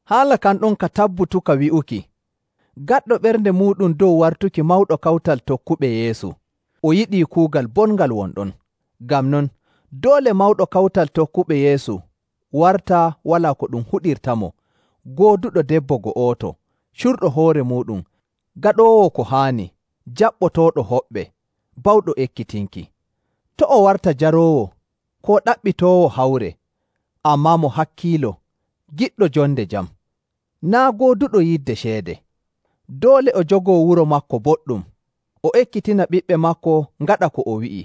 Haala kan ɗon ka tabbutuka wi'uki: Gaɗɗo ɓernde muuɗum dow wartuki mawɗo kawtal tokkuɓe Yeesu, o yiɗii kuugal bongal won ɗon. Ngam non doole mawɗo kawtal tokkuɓe Yeesu warta walaa ko ɗum huɗirtamo, gooduɗo debbo go'oto, curɗo hoore muuɗum, gaɗoowo ko haani, jaɓɓotooɗo hoɓɓe, bawɗo ekkitinki. To' o warta jaroowo, koo ɗaɓɓitoowo hawre, ammaa mo hakkiilo, giɗɗo jonde jam, naa' gooduɗo yidde ceede. Doole o jogoo wuro maako boɗɗum, o ekkitina ɓiɓɓe maako ngaɗa ko o wi'i,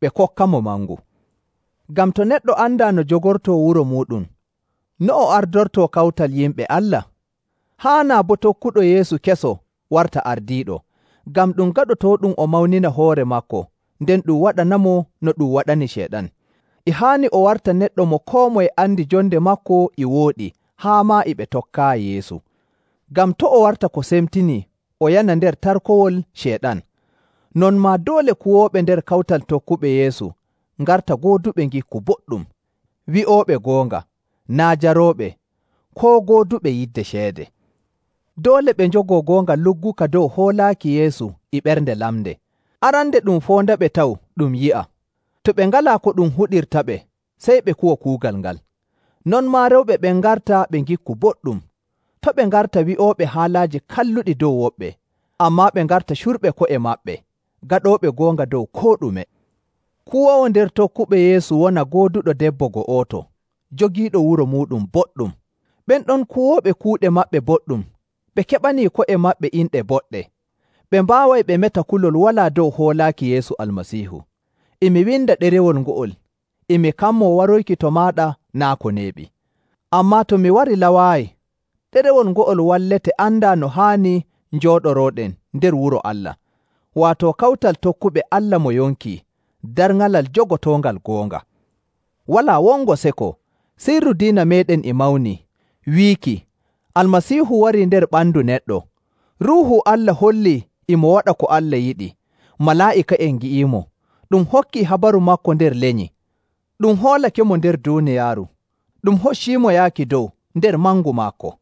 ɓe kokkamo mangu. Ngam to neɗɗo andaa no jogortoo wuro muuɗum, no o ardortoo kawtal yimɓe Allah? Haanaa boo tokkuɗo Yeesu keso warta ardiiɗo, ngam ɗum gaɗotooɗum o mawnina hoore maako, nden ɗum waɗanamo no ɗum waɗani Ceyɗan. E haani o warta neɗɗo mo koo moye andi jonde maako e wooɗi haa maa e ɓe tokkaayi Yeesu. Ngam to' o warta ko semtinii o yana nder tarkowol Ceyɗan. Non maa doole kuwooɓe nder kawtal tokkuɓe Yeesu ngarta gooduɓe ngikku boɗɗum, wi'ooɓe goonga, naa' jarooɓe, koo gooduɓe yidde ceede. Doole ɓe njogoo goonga lugguka dow hoolaaki Yeesu e ɓernde lamnde. Arande ɗum foondaɓe taw ɗum yi'a. To ɓe ngalaa ko ɗum huɗirtaɓe, sey ɓe kuwa kuugal ngal. Non maa rewɓe ɓen ngarta ɓe ngikku boɗɗum, to' ɓe ngarta bi'ooɓe haalaaji kalluɗi dow woɓɓe, ammaa ɓe ngarta curɓe ko'e maɓɓe, gaɗooɓe goonga dow koo ɗume. Kuwoowo nder tokkuɓe Yeesu wona gooduɗo debbo go'oto, jogiiɗo wuro muuɗum boɗɗum. Ɓen ɗon kuwooɓe kuuɗe maɓɓe boɗɗum, ɓe keɓani ko'e maɓɓe inɗe boɗɗe, ɓe mbaaway ɓe meta kulol walaa dow hoolaaki Yeesu Almasiihu. E mi winda ɗerewol ngo'ol, e mi kammoo waroyki to maaɗa naa' ko neeɓi. Ammaa to mi warilawaayi, ɗerewol ngo'ol wallete andaa no haani njooɗorooɗen nder wuro Allah, waato kawtal tokkuɓe Allah mo yonki, darŋalal jogotoongal goonga. Walaa wongo seko, sirru diina meeɗen e mawni, wiiki: Almasiihu warii nder ɓandu neɗɗo, Ruuhu Allah hollii e mo waɗa ko Allah yiɗi, malaa'ika'en ngi'iimo, ɗum hokkii habaru maako nder lenyi, ɗum hoolakemo nder duuniyaaru, ɗum hocciimo yaaki dow nder mangu maako.